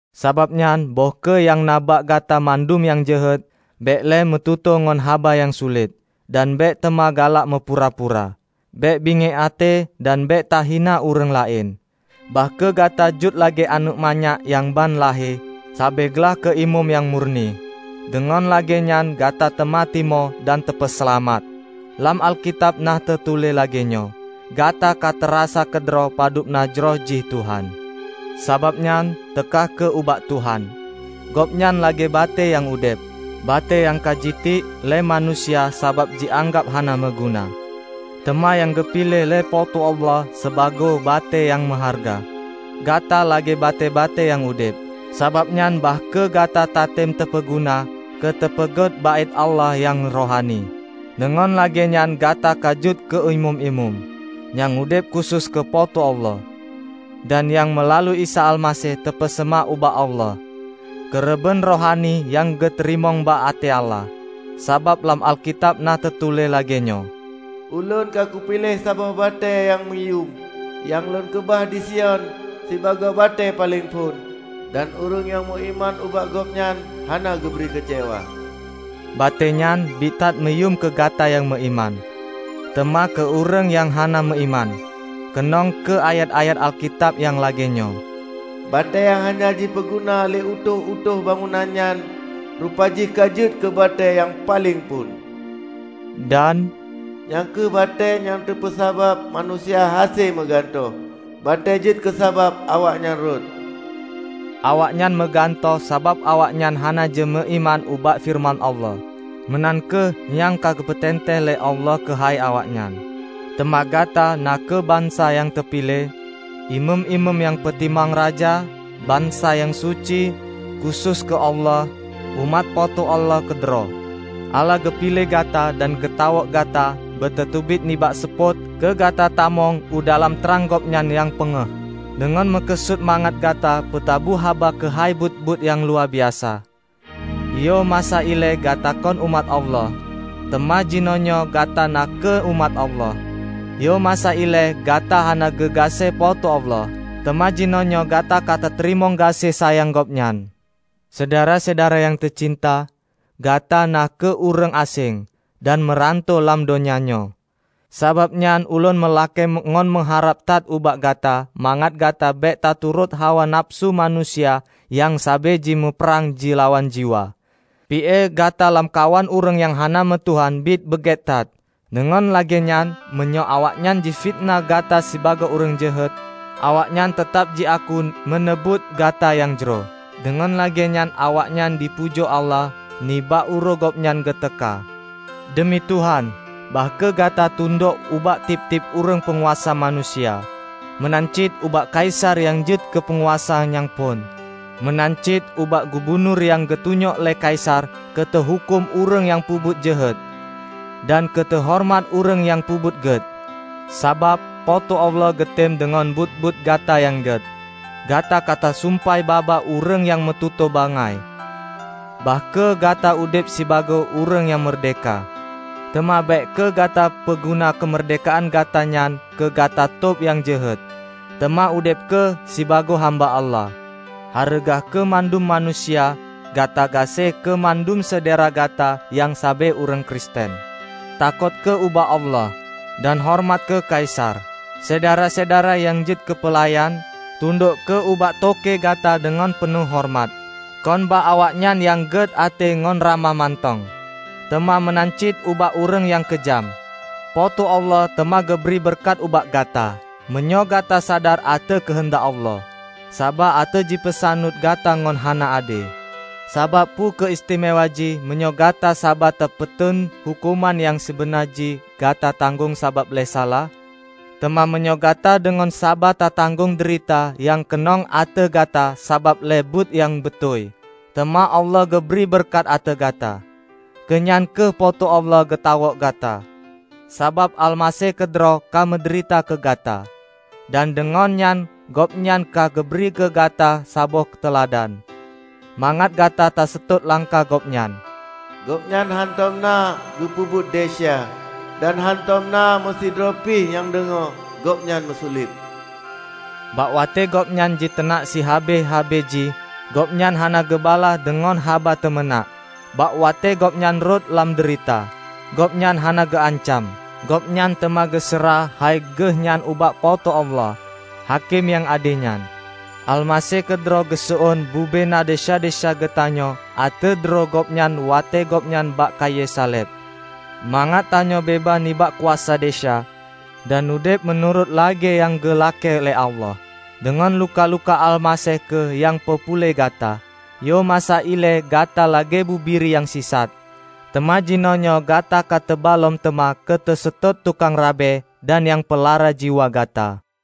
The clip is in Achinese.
Sabab nyan, böih kheueh nyang na bak gata mandum nyang jeuhet; bék lé meututoe ngon haba nyang sulet, dan bék teuma galak meupura-pura. Bék bingiek até, dan bék tahina ureuëng laén. Bah kheueh gata jeuet lagée aneuëk manyak nyang ban lahé, sabe glaih keu ié mom nyang murni. Deungon lagée nyan gata teuma timoh dan teupeuseulamat. Lam Alkitab na teutuléh lagée nyoe, "Gata ka tarasa keudroe padub na jroh jih Tuhan." Sabab nyan, teuka kheueh ubak Tuhan. Gobnyan lagée batée nyang udeb, batée nyang ka jitiek lé manusia sabab jianggab hana meuguna; teuma nyang geupiléh lé Po teu Allah sibagoe batée nyang meuhareuga. Gata lagée batée-batée nyang udeb. Sabab nyan bah kheueh gata tatem teupeuguna keuteupeugét Baét Allah nyang rohani. Deungon lagée nyan gata ka jeuet keu imeum-imeum, nyang udeb khusos keu Po teu Allah. Dan nyang meulalu Isa Almaseh teupeuseumah ubak Allah, keureubeuen rohani nyang geuteurimong bak até Allah. Sabab lam Alkitab na teutuléh lagée nyoe, "Ulôn ka kupiléh saboh batée nyang meuyuem, nyang Lôn keubah di Sion sibagoe batée paleng phon; dan ureuëng nyang meuiman ubak Gobnyan hana geubri keucewa." Batée nyan biet that meuyuem keu gata nyang meuiman. Teuma keu ureuëng nyang hana meuiman, keunong kheueh ayat-ayat Alkitab nyang lagée nyoe. "Batée nyang hana jipeuguna lé utôh-utôh bangunan nyan rupaji ka jeuet keu batée nyang paleng phon," dan "Nyang kheueh batée nyang teupeusabab manusia hase meugantoh, batée jeuet keusabab awaknyan rhot." Awaknyan meugantoh sabab awaknyan hana jimeuiman ubak feureuman Allah. Meunan kheueh nyang ka geupeuteuntée lé Allah keuhai awaknyan. Teuma gata na kheueh bansa nyang teupiléh, imeum-imeum nyang peutimang raja, bansa nyang suci, khusos keu Allah, umat Po teu Allah keudroe. Allah geupiléh gata dan geutawök gata beutateubiet nibak seupôt keu gata tamong u dalam trang Gobnyan nyang pengéh, deungon meukeusut mangat gata peutabu haba keuhai buet-buet nyang luwabiasa. Yoh masa ilée gata kon umat Allah, teuma jinoenyoe gata na kheueh umat Allah. Yoh masa ilée gata hana geugaséh Po teu Allah, teuma jinoenyoe gata ka tateurimong gaséh sayang Gobnyan. Syedara-syedara nyang teucinta! Gata na kheueh ureuëng aséng dan meuranto lam donya nyoe. Sabab nyan ulôn meulakée ngon meuharab that ubak gata mangat gata bék taturot hawa nafeusu manusia nyang sabe jimuprang jilawan jiwa. Pi-e gata lamkawan ureuëng nyang hana meu Tuhan biet beugét that, deungon lagée nyan meunyoe awaknyan jifiteunah gata sibagoe ureuëng jeuhet, awaknyan teutab jiaku meuneubuet gata nyang jroh, deungon lagée nyan awaknyan jipujoe Allah nibak uroe Gobnyan geuteuka. Deumi Tuhan, bah kheueh gata tundok ubak tieb-tieb ureuëng peunguasa manusia: meunan cit ubak Kaisar nyang jeuet keu peunguasa nyang phon, meunan cit ubak gubunur nyang geutunyok lé Kaisar keuteuhuköm ureuëng nyang peubuet jeuhet dan keu teuhoreumat ureuëng nyang peubuet gét. Sabab, Po teu Allah geutem deungon buet-buet gata nyang gét gata ka tasumpai babah ureuëng nyang meututoe bangai. Bah kheueh gata udeb sibagoe ureuëng nyang meurdehka, teuma bék kheueh gata peuguna keumeurdehkaan gata nyan keu gata tôb nyang jeuhet, teuma udeb kheueh sibagoe hamba Allah. Hareuga kheueh mandum manusia, gata gaséh kheueh mandum syedara gata nyang sabe ureuëng Kristen. Takot kheueh ubak Allah, dan horeumat kheueh Kaisar. Syedara-syedara nyang jeuet keupeulayan, tundok kheueh ubak toke gata deungon peunoh horeumat; kon bak awaknyan nyang gét até ngon ramah mantong, teuma meunan cit ubak ureuëng nyang keujam. Po teu Allah teuma geubri beureukat ubak gata, meunyoe gata sadar ateueh keuheundak Allah, saba ateueh jipeusaneut gata ngon hana ade. Sabab peu kheueh istimewa jih meunyoe gata saba tapeuteun huköman nyang sibeuna jih gata tanggong sabab lé salah? Teuma meunyoe gata deungon saba tatanggong deurita nyang keunong ateueh gata sabab lé buet nyang beutôi, teuma Allah geubri beureukat ateueh gata. Keu nyan kheueh Po teu Allah geutawök gata. Sabab Almaseh keudroe ka meudeurita keu gata, dan deungon nyan Gobnyan ka geubri keugata saboh teuladan, mangat gata taseutôt langkah Gobnyan. Gobnyan hántom na geupeubuet desya, dan hántom na meusidroe pih nyang deungoe Gobnyan meusulet. Bak watée Gobnyan jiteunak sihabéh-habéh jih, Gobnyan hana geubalaih deungon haba teumeunak. Bak watée Gobnyan rhot lam deurita, Gobnyan hana geuancam; Gobnyan teuma geuseurah hai Geuh nyan ubak Po teu Allah, Hakém nyang ade nyan. Almaseh keudroe geuseuôn bubena desya-desya geutanyoe ateueh droe Gobnyan watée Gobnyan bak kayée saleb, mangat tanyoe beubaih nibak kuasa desya, dan udeb meunurot lagée nyang geulakée lé Allah. Deungon luka-luka Almaseh kheueh nyang peupuléh gata. Yoh masa ilée gata lagée bubiri nyang sisat, teuma jinoenyoe gata ka teuba lom teuma keuteuseutôt tukang Rabe dan nyang Peulara jiwa gata.